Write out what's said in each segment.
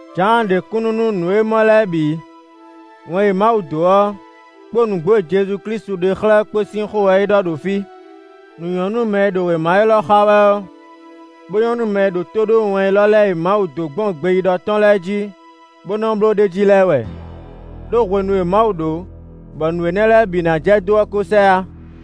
Jǎan ɖe kúnnu nú nǔ e é mɔ lɛ́ɛ bǐ. Wɛn e Mawu dó ɔ́, kpó nǔgbó e Jezu Klísu ɖe xlɛ́ ɔ́ kpó sín xó wɛ é ɖɔ ɖo fí. Nǔ nyɔ́ nú mɛ e ɖo wěma élɔ́ xa wɛ ɔ́, bó nyɔ́ nú mɛ e ɖo tó ɖó wɛn élɔ́ lɛ́ɛ e Mawu dó gbɔn gbeyíɖɔ tɔn lɛ́ɛ jí, bó nɔ́ bló ɖ'é jí lɛ́ɛ wɛ. Đó hwenu e Mawu ɖó bɔ nǔ énɛ́ lɛ́ɛ bǐ ná jɛ dó ɔ́ kó sɛ yá.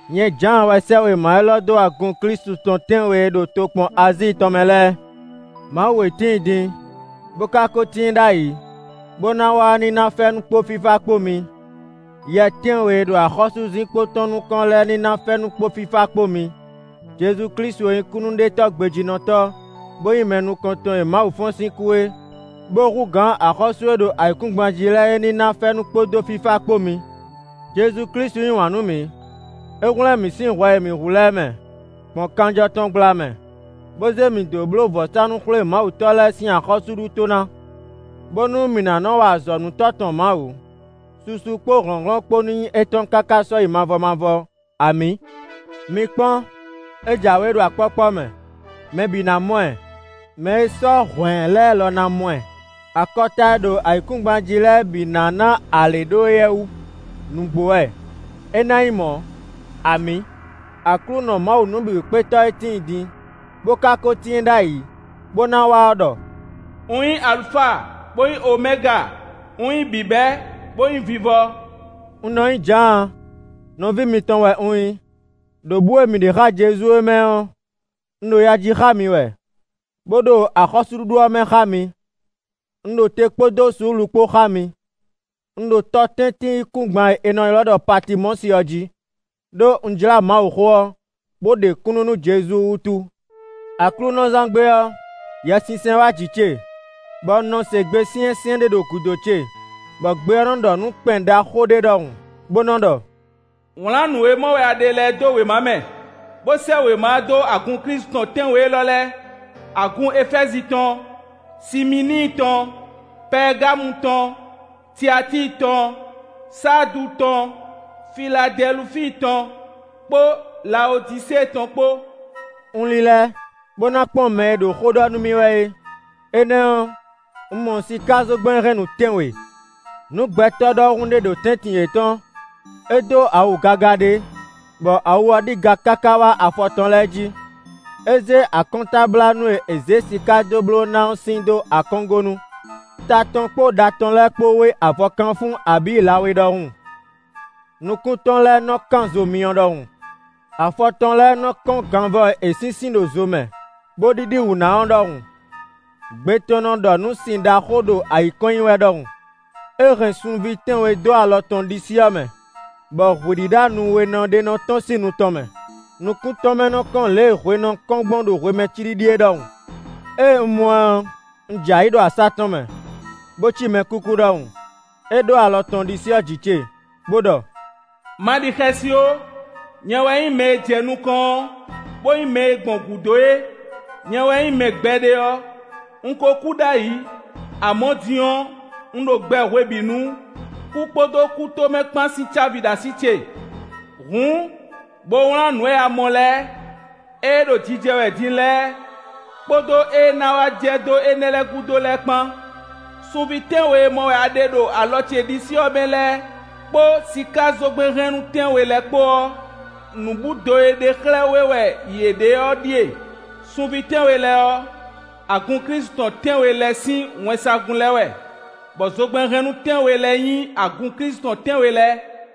Nyɛ Jǎan wɛ sɛ́ wěma élɔ́ dó agun Klísu tɔn tɛ́nwe e ɖo tokpɔn Azíi tɔn mɛ lɛ́ɛ: Mawu e tíin din, bó ka kó tíin ɖ'ayǐ, bó ná wá ɔ́ ní ná fɛ́nú kpó fífá kpó mi; yɛ tɛ́nwe e ɖo axɔ́súzinkpo tɔn nukɔn lɛ́ɛ ní ná fɛ́nú kpó fífá kpó mi; Jezu Klísu e nyí kúnnuɖetɔ́ gbejínɔtɔ́, bó nyí mɛ nukɔntɔn e Mawu fɔ́n sín kú é, bó hú gǎn axɔ́sú e ɖo ayǐkúngban jí lɛ́ɛ é ní ná fɛ́nú kpódó fífá kpó mi. Jezu Klísu yí wǎn nú mǐ; é hwlɛ́n mǐ sín hwɛ e mǐ hu lɛ́ɛ mɛ, gbɔn kanjɔ tɔn gbla mɛ; bó zé mǐ dó bló vɔ̌sánú-xwlémawutɔ́ lɛ́ɛ sín axɔ́súɖuto ná, bónú mǐ ná nɔ wa azɔ̌ nú Tɔ́ tɔn Mawu. Susu kpó hlɔ̌nhlɔ́n kpó ní nyí étɔn káká sɔ́yi mavɔ mavɔ! Amǐ. Mi kpɔ́n! É jǎwe ɖo akpɔ́kpɔ́ mɛ! Mɛ bǐ ná mɔ ɛ; mɛ e sɔ́ hwǎn ɛ lɛ́ɛ lɔ ná mɔ ɛ. Akɔta e ɖo ayǐkúngban jí lɛ́ɛ bǐ ná ná alě ɖó éyɛ́ wú. Nǔgbó wɛ, é ná nyí mɔ̌! Amǐ. Aklúnɔ Mawu Nǔbǐwúkpétɔ́ e tíin din, bó ka kó tíin ɖ'ayǐ, bó ná wá ɔ́ ɖɔ: “Un nyí Alufa, bó nyí Omɛga; un nyí bǐbɛ́, bó nyí vivɔ.” Un nɔ nyí Jǎan; nɔví mitɔn wɛ un nyí; ɖo bǔ e mǐ ɖe xá Jezu é mɛ ɔ́, un ɖo ya ji xá mi wɛ, bó ɖo axɔ́súɖuɖu ɔ́ mɛ xá mi; un ɖo te kpódó suúlu kpó xá mi. Un ɖo tɔtɛ́ntin-yíkúngban e è nɔ ylɔ́ ɖɔ Patimɔ́si ɔ́ jí, ɖó un jlá Mawuxó ɔ́ bó ɖe kúnnu nú Jezu wútu. Aklúnɔzán gbe ɔ́, Yɛsinsɛn wá jǐ ce, bɔ un nɔ se gbe syɛ́nsyɛ́n ɖé ɖo gǔdo ce, bɔ gbe ɔ́ nɔ́ ɖɔ nǔ kpɛn ɖaxó ɖé ɖɔhun, bó nɔ́ ɖɔ: “Wlǎn nǔ e mɔ wɛ a ɖe lɛ́ɛ dó wěma mɛ, bó sɛ́ wěma ɔ́ dó agun Klísu tɔn tɛ́nwe élɔ́ lɛ́ɛ: agun Efɛ́zi tɔn, Simíini tɔn, Pɛɛgamu tɔn, Tiatíi tɔn, Saadu tɔn, Filadɛlufíi tɔn kpó Lawodisée tɔn kpó.” Un lílɛ́, bó ná kpɔ́n mɛ e ɖo xó ɖɔ nú mì wɛ é; énɛ́ ɔ́, un mɔ sikázogbɛ́nhɛnnú tɛ́nwe. Nǔ gbɛtɔ́ ɖɔhun ɖé ɖo tɛ́ntin yětɔn; é dó awu gaga ɖé, bɔ awu ɔ́ ɖi ga káká wá afɔ tɔn lɛ́ɛ jí; é zé akɔ́ntablánú e è zé siká dó bló ná ɔ́ sin dó akɔ́ngónu. Ta tɔn kpó ɖa tɔn lɛ́ɛ kpó wé avɔkanfún abǐ lawé ɖɔhun; nukún tɔn lɛ́ɛ nɔ́ kán zo myɔ ɖɔhun. Afɔ tɔn lɛ́ɛ nɔ kɔ́n ganvɔ e è sínsín ɖo zo mɛ, bó ɖíɖí wǔ ná ɔ́ ɖɔhun; gbe tɔn nɔ ɖɔ nǔ sin ɖaxó ɖo ayǐ kɔn nyi wɛ ɖɔhun. É hɛn sunví tɛ́nwe dó alɔ tɔn ɖisí ɔ́ mɛ, bɔ hwǐ ɖíɖá nu we nɔ ɖé nɔ tɔ́n sín nu tɔn mɛ; nukún tɔn mɛ nɔ kɔ́n lě e hwe nɔ kɔ́n gbɔn ɖo hwemɛ cíɖíɖí é ɖɔhun. Ée un mɔ ɛ ɔ́, un jɛ ayǐ ɖo asá tɔn mɛ, bó cí mɛkúkú ɖɔhun. É ɖó alɔ tɔn ɖisí ɔ́ jǐ ce, bó ɖɔ: “Ma ɖi xɛsi ó! Nyɛ wɛ nyí mɛ e jɛ nukɔn ɔ́, bó nyí mɛ e gbɔn gǔdo é. Nyɛ wɛ nyí mɛ gbɛɖe ɔ́. Un ko kú ɖ'ayǐ; amɔ̌ din ɔ́, un ɖo gbɛ hwebǐnu; kú kpódó kútomɛ kpán sín cávi ɖo así ce. Hǔn, bo wlán nǔ e a mɔ lɛ́ɛ: ée ɖo jijɛ wɛ din lɛ́ɛ kpódó ée ná wá jɛ dó énɛ́ lɛ́ɛ gúdo lɛ́ɛ kpán. Sunví tɛ́nwe e mɔ wɛ a ɖe ɖo alɔ ce ɖisí ɔ́ mɛ lɛ́ɛ kpó sikázogbɛ́nhɛnnú tɛ́nwe lɛ́ɛ kpó ɔ́, nǔbúdo e ɖe xlɛ́ wɛ yě ɖe ɔ́ ɖíe: sunví tɛ́nwe lɛ́ɛ ɔ́, agun Klísu tɔn tɛ́nwe lɛ́ɛ sín wɛnsagun lɛ́ɛ wɛ; bɔ zogbɛ́nhɛnnú tɛ́nwe lɛ́ɛ nyí agun Klísu tɔn tɛ́nwe lɛ́ɛ.”